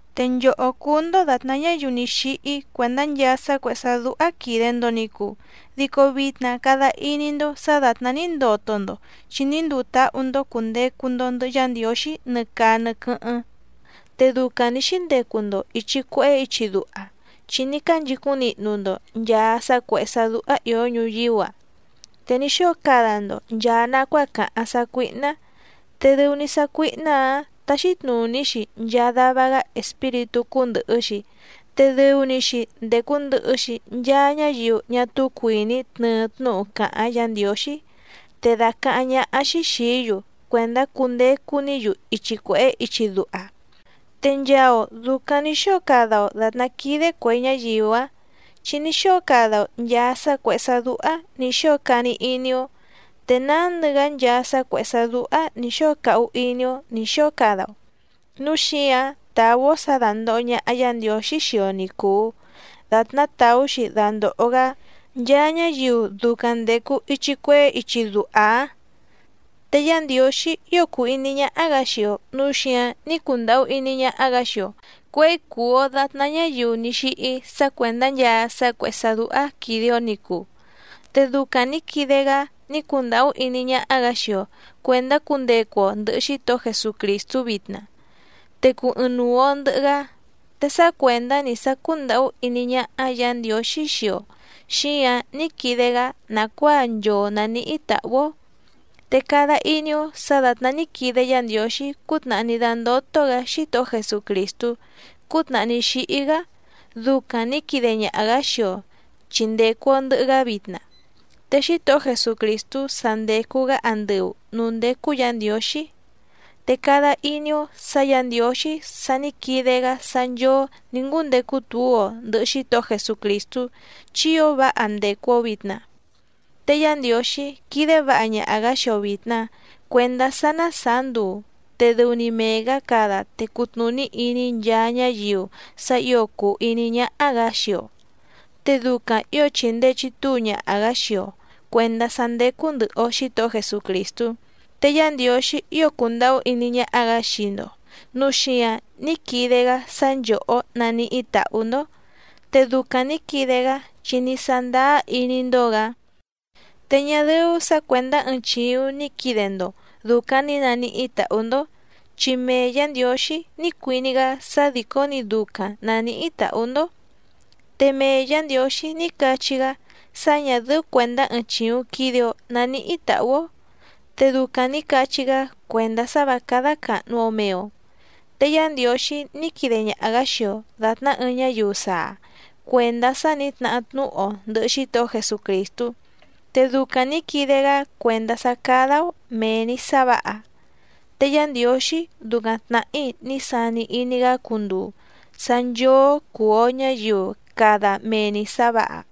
Te nchòhó cúú‑ndó dàtná ñáyiu ní xíhí cuèndá nchaa sá cuèhé sá dúhá quìde‑ndo ni cuu, dico vitna cada iní‑ndó sǎ dàtná ní ndoto‑ndo chi ní nduu táhú‑ndó cùndecu‑ndo ndɨhɨ Yá Ndiǒxí nɨ caa nɨ quɨ́hɨ́ⁿ. Te ducaⁿ nǐ xíndecu‑ndo ìchi cuehé ichi duha, chi ní cánchicúⁿ nihnu‑ndo nchàa sá cuèhé sá dúhá ìó ñuyíú‑a, te ní xóo cada‑ndo nchàa nacuáa càháⁿ sácuíhná, te dɨu‑ni sácuíhná‑ǎⁿ táxí tnùní‑xi nchaa dava‑gá espíritú cúndɨ̀hɨ‑xi, te dɨu‑ni‑xi ndècu ndɨhɨ‑xi nchaa ñáyiu ñá túú cuìní tnɨɨ tnúhu càháⁿ Yǎ Ndiǒxí, te dàcaháⁿ ñáhá‑xí xìí‑yu cuèndá cundecu‑ní‑yu ichi cuèhé ichi duha. Te nchaa‑o dùcaⁿ ní xóo cada‑o dàtná quídé cuè ñáyiu‑áⁿ, chi ní xóo cada‑o nchàa sá cuèhé sá dúhá nǐ xóo cani iní‑ó, te nándɨ‑gá nchaa sá cuèhé sá dúhá nǐ xóo cahu iní‑ó nǐ xóo cada‑o, núu xíǎⁿ tàú‑ó sǎ dándòho ñaha Yá Ndiǒxí xii‑o ni cùu datná tàú‑xi dandòho‑gá nchaa ñáyiu ducaⁿ ndècu ichi cuehé ichi duha‑áⁿ. Te Yá Ndiǒxí ío cùu iní ñáhá‑gǎ xii‑o nǔu xíǎⁿ ní cundàhú iní ñáhá‑gǎ xii‑o cuěi cùu‑o datná ñáyiu ní xíhí sá cuèndá nchaa sá cuèhé sá dúhá quìde‑o ni cuu. Te ducaⁿ nǐ quide‑gá ní cundàhú iní ñáhá‑gǎ xii‑o cuèndá cundecu‑o ndɨ̀hɨ Xítohó Jesucrìstú vitna, te cuu ɨɨⁿnuu‑o ndɨ̀hɨ‑gá. Te sá cuèndá‑ni sá cúndàhú iní ñáhá Yǎ Ndiǒxí xii‑o xíǎⁿ ní quide‑gá nàcuáa nchoo nàníhí tàhú‑ó. Te cada iní‑ó sǎ dàtná ní quide Yá Ndiǒxí cútnàhá ní dándótó‑gǎ Xítohó Jesucrìstú cútnàhá ní xíhí‑gá ducaⁿ nǐ quide ñaha‑gǎ xii‑o chi ndècu‑o ndɨhɨ‑gá vitna. Te Xítohó Jesucrìstú sa ndècu‑gá andɨu nǔú ndécú Yǎ Ndiǒxí. Te cada iní‑ó sǎ Yǎ Ndiǒxí sa ní quide‑gá sá nchóó nǐ ngúndecu túu‑o ndɨ̀hɨ Xítohó Jesucrìstú, chi ío váha ndècu‑o vitna. Te Yá Ndiǒxí quídé vǎha ñaha‑gǎ xii‑o vìtna cuendá sá ná sàá nduu, te dɨu‑ni mee‑gǎ cada te cutnùní iní nchaa ñáyiu sá ǐo cùu iní ñáhá‑gǎ xii‑o, te ducaⁿ ǐo chìndee chitúu ñaha‑gǎ xii‑o cuèndá sá ndécú ndɨ̀hɨ‑o Xítohó Jesucrìstú. Te Yá Ndiǒxí ío cùndahú iní ñáhá‑gǎ xii‑ndo nǔu xíǎⁿ ní quide‑gá sá nchòhó naníhí tàhú‑ndó. Te ducaⁿ nǐ quide‑gá chi ní sándáá iní‑ndó‑gǎ. Te ñá dɨ́ú sǎ cuèndá ɨɨⁿ chìuⁿ ni quide‑ndo ducaⁿ ní nàníhí tàhú‑ndó, chi mee Yǎ Ndiǒxí ní cuiní‑gá sá dìcó‑ni ducaⁿ nàníhí tàhú‑ndó. Te mee Yǎ Ndiǒxí ní cachí‑gá sá ñà dɨ́ú cuèndá ɨɨⁿ chìuⁿ quide‑o naníhí tàhú‑ó, te ducaⁿ nǐ cachí‑gá cuèndá sá vǎ cádá càhnu‑o mee‑o. Te Yá Ndiǒxí ní quide ñaha‑gǎ xii‑o dàtná ɨɨⁿ ñáyiu saa cuèndá sá nǐ tnahá tnúhu‑o ndɨ̀hɨ Xítohó Jesucrìstú, te ducaⁿ nǐ quide‑gá cuèndá sá cádá‑ó mèe‑ni sá vǎha. Te Yá Ndiǒxí ducaⁿ tnàhí ní sani iní‑gá cunduu sá nchóó cùu‑o ñáyiu cada mee‑ni sǎ vǎha.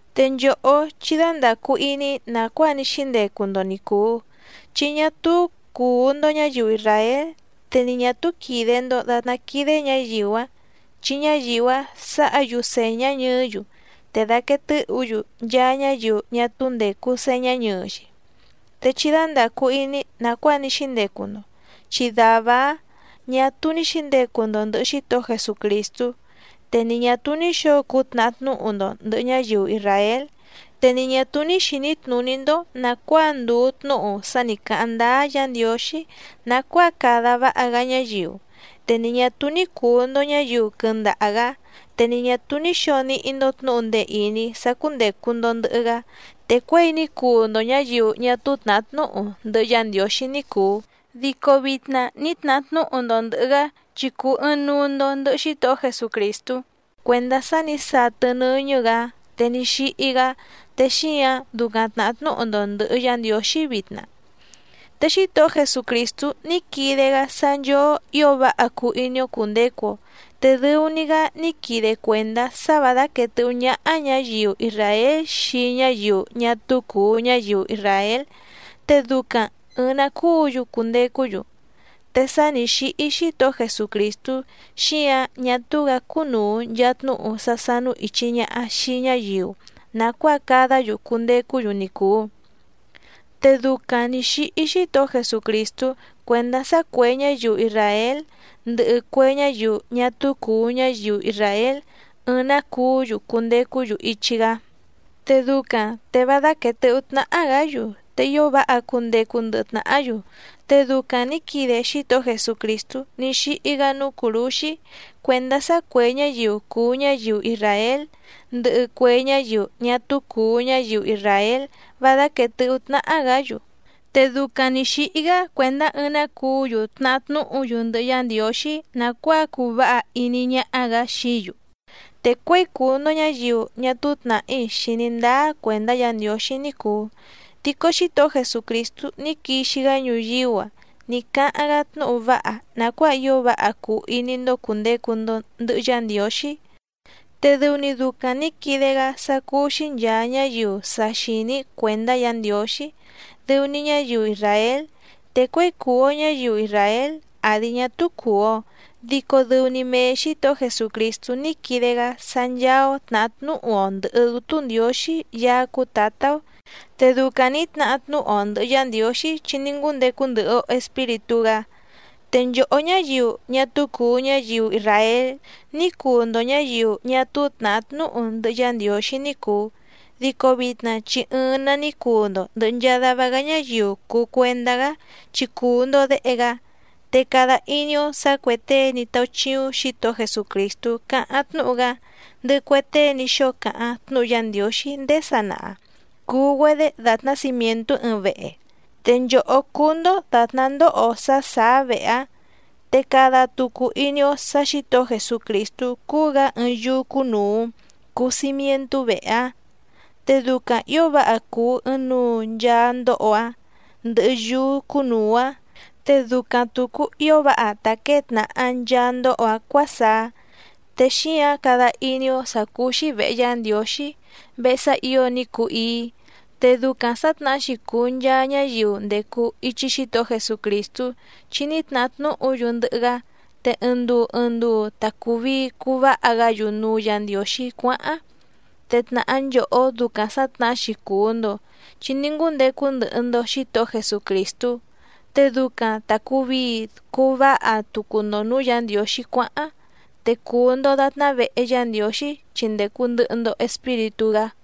Te nchòhó chí dándàcu iní nàcuáa ní xíndecu‑ndo ni cùu, chi ñá túú cùu‑ndo ñáyiu isràél, te ni ñà túú quìde‑ndo datná quídé ñǎyiu‑áⁿ, chi ñáyiu‑áⁿ sǎha‑yu sèñá ñɨɨ́‑yu, te dàquee tɨ́hǔ‑yu nchaa ñáyiu ñá túú ndècu señá ñɨɨ‑xi. Te chí dándàcu iní nàcuáa ní xíndecu‑ndo, chi dàvá‑áⁿ ñà túú ní xǐndecu‑ndo ndɨ̀hɨ Xítohó Jesucrìstú, te ni ñà túú ní xǒo cuu tnahá tnúhu‑ndo ndɨ̀hɨ ñáyiu isràél, te ni ñà túú ní xìní tnùní‑ndó nàcuáa ndùu tnúhu sá nǐ cáháⁿ ndáá Yǎ Ndiǒxí nàcuáa cada váha‑gá ñáyiu, te ni ñà túú ní cùu‑ndo ñáyiu quɨndaha‑gǎ, te ni ñà túú ní xǒo níhí‑ndó tnǔhu ndee ìní sá cúndècu‑ndo ndɨhɨ‑gá. Te cuěi ní cuu‑ndo ñǎyiu ñá túú tnàhá tnúhu ndɨhɨ Yá Ndiǒxí ní cùu, dico vitna ní tnahá tnúhu‑ndo ndɨ̀hɨ‑gá chi cùu ɨɨⁿnuu‑ndo ndɨhɨ Xítohó Jesucrìstú, cuèndá sá nǐ satɨ nɨ́ñɨ́‑gǎ te ní xíhí‑gá te xíǎⁿ ducaⁿ tnàhá tnúhu‑ndo ndɨ̀hɨ Yá Ndiǒxí vitna. Te Xítohó Jesucrìstú ní quide‑gá sá nchóó ǐo váha cuu iní‑ó cùndecu‑o, te dɨu‑ni‑gá ní quide cuèndá sá vǎ dáquèe tɨ́hú ñáhá ñǎyiu isràél xii ñáyiu ñá túú cùu ñáyiu isràél, te ducaⁿ ɨ̀ɨⁿ‑ná cuú‑yu cundecú‑yu. Te sá nǐ xíhí Xítohó Jesucrìstú, xíǎⁿ ñá túú‑gǎ cúnùu nchaa tnúhu sá sánú ìchi ñaha xii ñáyiu nàcuáa cadá‑yu cundecú‑yu ni cùu. Te ducaⁿ nǐ xíhí Xítohó Jesucrìstú cuèndá sá cuè ñáyiu isràél ndɨhɨ cue ñáyiu ñá túú cùu ñáyiu isràél ɨɨⁿ‑nǎ cuú‑yu cundecú‑yu ichi‑gá, te ducaⁿ te vá dáquèe tɨhú tnáhá‑gǎ‑yu, te ío váha cundecu ndɨhɨ tnàhá‑yu. Te ducaⁿ nǐ quide Xítohó Jesucrìstú ní xíhí‑gá núú cùrúxí cuèndá sá cuè ñáyiu cùu ñáyiu isràél ndɨhɨ cue ñáyiu ñá túú cùu ñáyiu isràél vá dáquèe tɨhú tnáhá‑gǎ‑yu. Te ducaⁿ nǐ xíhí‑gá cuèndá ɨɨⁿ‑nǎ cuú‑yu tnahá tnúhu‑yu ndɨhɨ Yá Ndiǒxí nàcuáa cuu váha iní ñáhá‑gǎ xií‑yu. Te cuěi cùu‑ndo ñáyiu ñá túú tnàhí xìní ndáá cuèndá Yǎ Ndiǒxí ní cùu, dico Xítohó Jesucrìstú ní quixi‑gá ñuyíú‑a ní cáháⁿ‑gá tnúhu váha nàcuáa ío váha cuu iní‑ndó cùndecu‑ndo ndɨhɨ Yá Ndiǒxí. Te dɨu‑ni ducaⁿ nǐ quide‑gá sá cúú‑xí nchàa ñáyiu sa xìní cuèndá Yǎ Ndiǒxí, dɨu‑ni ñáyiu isràél. Te cuěi cùu‑o ñáyiu isràél àdi ñá túú cùu‑o dico dɨu‑ni mee Xǐtohó Jesucrìstú ní quide‑gá sá ncháá‑ó tnàhá tnúhu‑o ndɨ̀hɨ Dútú Ndiǒxí Yaá cúú Tǎtá‑ó. Te ducaⁿ nǐ tnahá tnúhu‑o ndɨ̀hɨ Yá Ndiǒxí chi ní ngúndecu ndɨhɨ‑o Espíritú‑gá. Te nchòhó ñáyiu ñá túú cùu ñáyiu isràél ní cuu‑ndo ñǎyiu ñá túú tnàhá tnúhu ndɨhɨ Yá Ndiǒxí ní cùu, dico vitna chi ɨɨⁿ‑nǎ ní cuu‑ndo ndɨ̀hɨ nchaa dava‑gá ñáyiu cùu cuendá‑gá chi cùu‑ndo déhe‑gá. Te cada iní‑ó sǎ cuè tée ní táúchíúⁿ Xǐtohó Jesucrìstú cáháⁿ tnúhu‑gá, ndɨhɨ cue tée ní xóo cáháⁿ tnúhu Yá Ndiǒxí ndéé sanaha cùu‑güedé dàtná cimièntú ɨɨⁿ vehe, te nchòhó cúú‑ndó dàtná ndóho sá sàá vehe‑áⁿ, te cada tucu iní‑ó sǎ Xǐtohó Jesucrìstú cúú‑gǎ ɨɨⁿ yúú cúnùu cuu cimientú vehe‑áⁿ. Te ducaⁿ ǐo váha cùu ɨɨⁿnuu nchaa ndóho‑áⁿ ndɨhɨ yúú cúnùu‑áⁿ, te ducaⁿ tùcu ío váha ta quěe tnàha nchaa ndóho‑áⁿ cuǎsaá. Te xíǎⁿ cada iní‑ó sǎ cúú‑xí vèhe Yá Ndiǒxí, vehe sá ǐo ní cuu íí. Te ducaⁿ sǎtnahá‑xi cùu nchaa ñáyiu ndècu ichi Xítohó Jesucrìstú chi ní tnahá tnúhu‑yu ndɨhɨ‑gá, te ɨɨⁿ nduu ɨɨⁿ nduu ta cùu vii cuu váha‑gá‑yu núú Yǎ Ndiǒxí cuáháⁿ. Te tnàhá nchòhó ducaⁿ sǎtnahá‑xi cùu‑ndo chi ní ngúndecu ndɨhɨ‑ndo Xǐtohó Jesucrìstú, te ducaⁿ ta cùu vii cuu váha tucu‑ndo nǔú Yǎ Ndiǒxí cuáháⁿ, te cùu‑ndo datná vehe Yá Ndiǒxí chi ndècu ndɨhɨ‑ndo Espíritú‑gá.